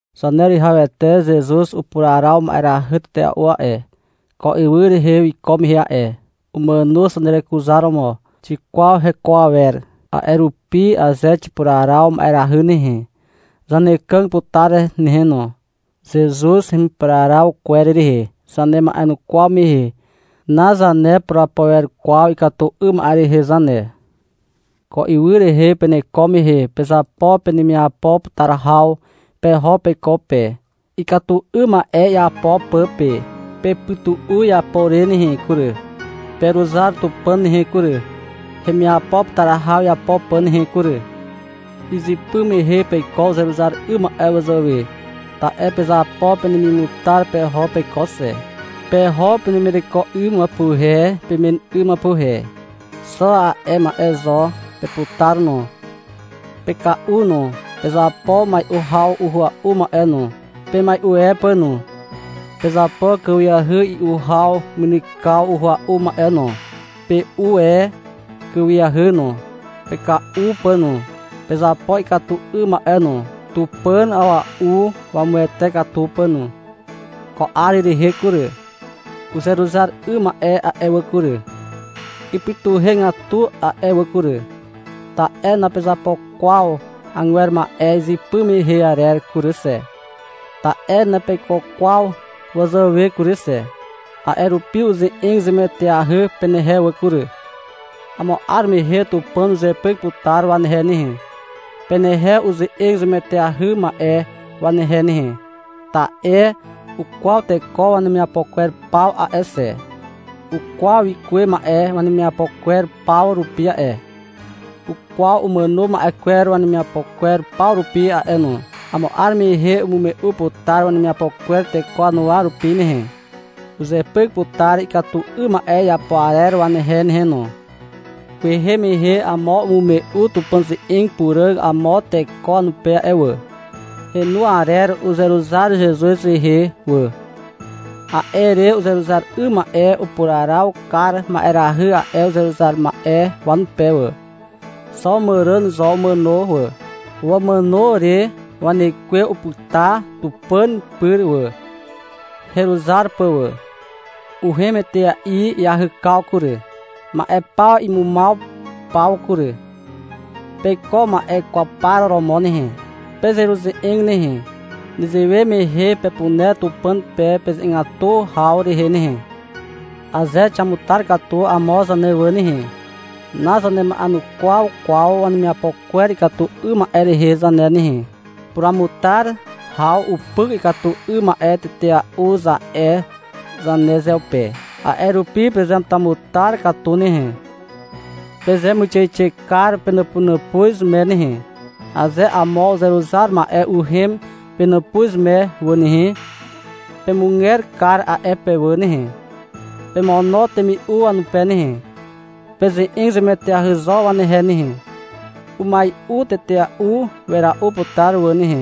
Zaneruwihawete Zezuz upuraraw ma'erahy tetea'u a'e, ko ywy rehe wiko mehe a'e. Umàno zanerekuzaromo. Xikwaw heko awer. A'e rupi aze xipuraraw ma'erahy nehe, zanekàg putar nehe no. Zezuz hemipuraraw kwer rehe zanema'enukwaw mehe nazanepurapo wer kwaw ikatu 'ym ma'e rehe zane. Ko ywy rehe peneko mehe pezapo penemiapo putar haw peho peiko pe, ikatu 'ym ma'e iapo pà pe. Pepytu'u iapo re nehe kury. Peruzar Tupàn nehe kury, hemiapo putar haw iapo pà nehe kury. Izypy mehe peiko uzeruzar 'ym ma'e wazàwe, ta'e pezapo penemimutar peho peiko xe. Peho penemireko 'ym wapuhe pemen 'ym wapuhe. Xo a'e ma'e zo peputar no. Peka'u no. Pezapo mai'u haw uhua'u ma'e no, pemai'u e pà no. Pezapo kàwiahy i'u haw mynykaw uhua'u ma'e no. Pe'u e kàwiahy no, peka'u pà no. Pezapo ikatu 'ym ma'e no, Tupàn a'ua'u wamuwete katu pà no. Ko 'ar rehe kury, uzeruzar 'ym ma'e a'e wà kury, ipytuhegatu a'e wà kury, ta'e napezapo kwaw agwer ma'e izypy mehe arer kury xe, ta'e napeiko kwaw wazàwe kury xe. A'e rupi uze'eg zemueteahy penehe wà kury. Amo 'ar mehe Tupàn uzepyk putar wanehe nehe, penehe uze'eg zemueteahy ma'e wanehe nehe. Ta'e ukwaw teko wanemiapo kwer paw a'e xe. Ukwaw wikuwe ma'e wanemiapo kwer paw rupi a'e. Ukwaw umàno ma'e kwer wanemiapo kwer paw rupi a'e no. Amo 'ar mehe umume'u putar wanemiapo kwer teko wanuwa rupi nehe. Uzepyk putar ikatu 'ym ma'e iapo arer wanehe nehe no. Kwehe mehe amo umume'u Tupàn ze'eg puràg amo teko wanupe a'e wà. Henu arer uzeruzar Zezuz rehe wà. A'e re uzeruzar 'ym ma'e upuraraw kar ma'erahy a'e uzeruzar ma'e wanupe wà. Xo màràn zo umàno wà. Wamàno re wanekwe upyta Tupàn pyr wà, heruzar pà wà. Uhem etea'i iahykaw kury, ma'e paw imumaw paw kury. Peiko ma'e kwaw par romo nehe. Pezeruze'eg nehe. Nezewe mehe pepuner Tupàn pe peze'egatu haw rehe nehe. Aze xiamutar katu amo zane wà nehe, nazanema'enukwaw kwaw wanemiapo kwer ikatu 'ym ma'e rehe zane nehe. — Puramutar haw upyk ikatu 'ym ma'e tetea'u, za'e zanezeupe. A'e rupi pezeamutamutar katu nehe. Pezemuixeixe kar penàpunàpuz me nehe. Aze amo uzeruzar ma'e uhem penàpuz me wà nehe, pemuger kar a'e pe wà nehe, pemono temi'u wanupe nehe. Peze'eg zemueteahy zo wanehe nehe. — Umai'u tetea'u wera'u putar wà nehe,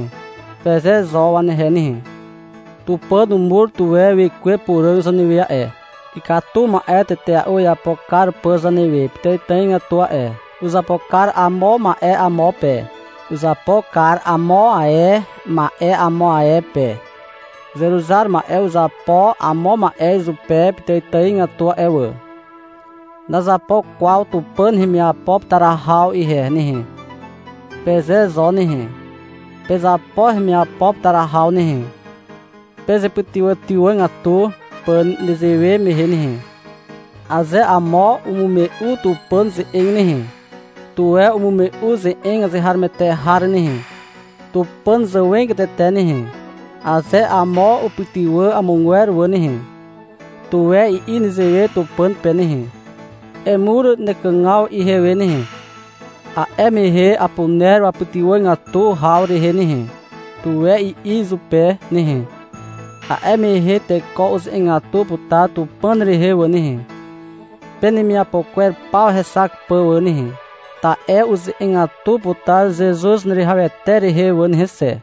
peze zo wanehe nehe. Tupàn umur tuwe Wekwe Puràg zanewe a'e, ikatu ma'e tetea'u iapo kar pà zanewe pitàitàigatu a'e. Uzapo kar amo ma'e amo pe. Uzapo kar amo ae ma'e amo ae pe. Uzeruzar ma'e uzapo amo ma'e izupe pitàitàigatu a'e wà. — Nazapo kwaw Tupàn hemiapo putar haw ihe nehe, peze zo nehe. Pezapo hemiapo putar haw nehe, pezepytywàtywàgatu pà nezewe mehe nehe. Aze amo umume'u Tupàn ze'eg nehe, tuwe umume'u ze'eg azeharomoete har nehe, Tupàn zàwegatete nehe. Aze amo upytywà amogwer wà nehe, tuwe i'i nezewe Tupàn pe nehe. — Emur nekàgaw ihewe nehe. A'e mehe apuner wapytywàgatu haw rehe nehe, tuwe i'i izupe nehe. A'e mehe teko uze'egatu putar Tupàn rehe wà nehe, penemiapo kwer paw hexak pà wà nehe, ta'e uze'egatu putar Zezuz Zaneruwihawete rehe wà nehe xe.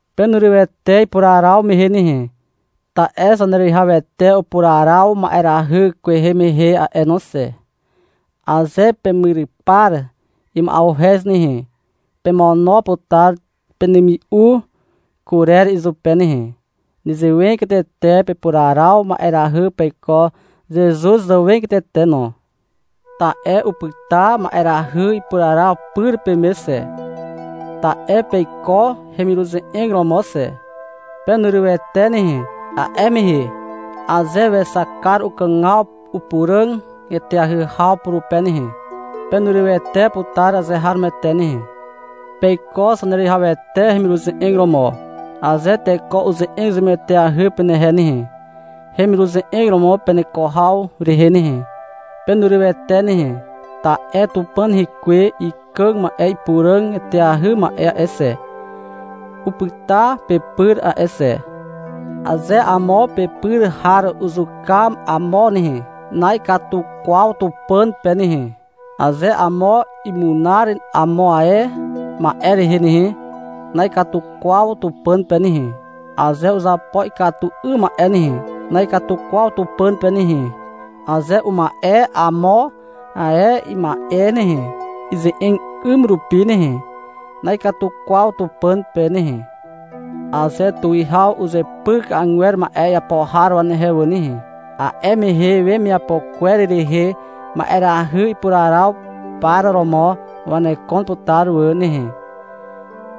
Penurywete ipuraraw mehe nehe. Ta'e Zaneruwihawete upuraraw ma'erahy kwehe mehe a'e no xe. Aze pemyrypar ima'uhez nehe, pemono putar penemi'u kurer izupe nehe. Nezewegatete pepuraraw ma'erahy peiko Zezuz zàwegatete no. Ta'e upyta ma'erahy ipuraraw pyr peme xe. Ta'e peiko hemiruze'eg romo xe. Penurywete nehe, a'e mehe, aze wexak kar ukàgaw upuràg eteahy haw purupe nehe, penurywete putar azeharomoete nehe. Peiko Zaneruwihawete hemiruze'eg romo. Aze teko uze'eg zemueteahy penehe nehe, hemiruze'eg romo peneko haw rehe nehe, penurywete nehe, ta'e Tupàn Hekwe ikàg ma'e ipuràg eteahy ma'e a'e xe, upyta pepyr a'e xe. Aze amo pepyr har uzuka amo nehe, na'ikatu kwaw Tupàn pe nehe. Aze amo imunar amo ae ma'e rehe nehe, na'ikatu kwaw Tupàn pe nehe. Aze uzapo ikatu 'ym ma'e nehe, na'ikatu kwaw Tupàn pe nehe. Aze uma'e amo ae ima'e nehe, ize'eg 'ym rupi nehe, na'ikatu kwaw Tupàn pe nehe. Aze tuwihaw uzepyk agwer ma'e iapo har wanehe wà nehe, a'e mehe wemiapo kwer rehe ma'erahy ipuraraw par romo wanekon putar wà nehe.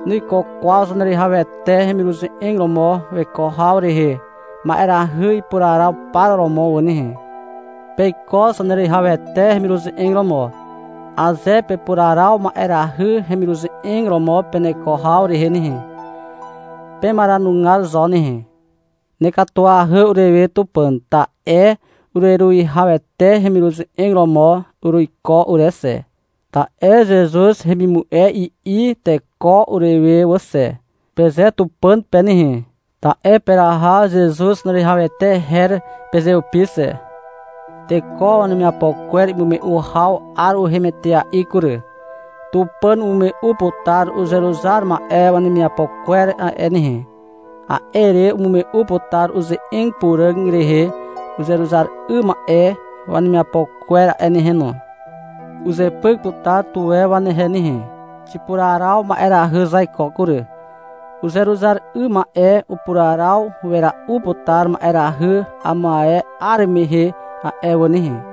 Nuiko kwaw Zaneruwihawete hemiruze'eg romo weko haw rehe ma'erahy ipuraraw par romo wà nehe. Peiko Zaneruwihawete hemiruze'eg romo. Aze pepuraraw ma'erahy hemiruze'eg romo peneko haw rehe nehe, pemaranugar zo nehe. — Nekatuahy urewe Tupàn, ta'e ureruwihawete hemiruze'eg romo uruiko ure xe, ta'e — Zezuz hemimu'e, i'i teko urewe wà xe, peze Tupàn pe nehe. (Ta'e peraha Zezuz Zaneruwihawete her pezeupi xe.) Teko wanemiapo kwer imume'u haw 'ar uhem etea'i kury. Tupàn umume'u putar uzeruzar ma'e wanemiapo kwer a'e nehe. A'e re umume'u putar uze'eg puràg rehe uzeruzar 'ym ma'e wanemiapo kwer a'e nehe no. Uzepyk putar tuwe wanehe nehe. Xipuraraw ma'erahy zaiko kury. Uzeruzar 'ym ma'e upuraraw wera'u putar ma'erahy amo ae 'ar mehe a'e wà nehe.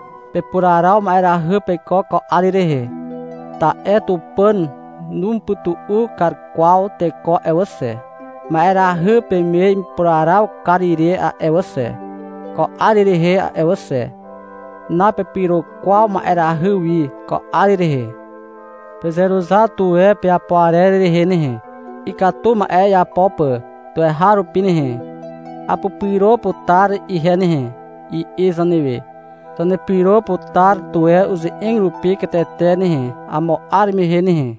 Pepuraraw ma'erahy peiko ko 'ar rehe, ta'e Tupàn numupytu'u kar kwaw teko a'e wà xe, ma'erahy peme ipuraraw kar ire a'e wà xe, ko 'ar rehe a'e wà xe. Napepyro kwaw ma'erahy wi ko 'ar rehe. Pezeruzar tuwe peapo arer rehe nehe, ikatu ma'e iapo pà tuweharupi nehe. — Apupyro putar ihe nehe, i'i zanewe. Zanepyro putar tuwe uze'eg rupi katete nehe amo 'ar mehe nehe.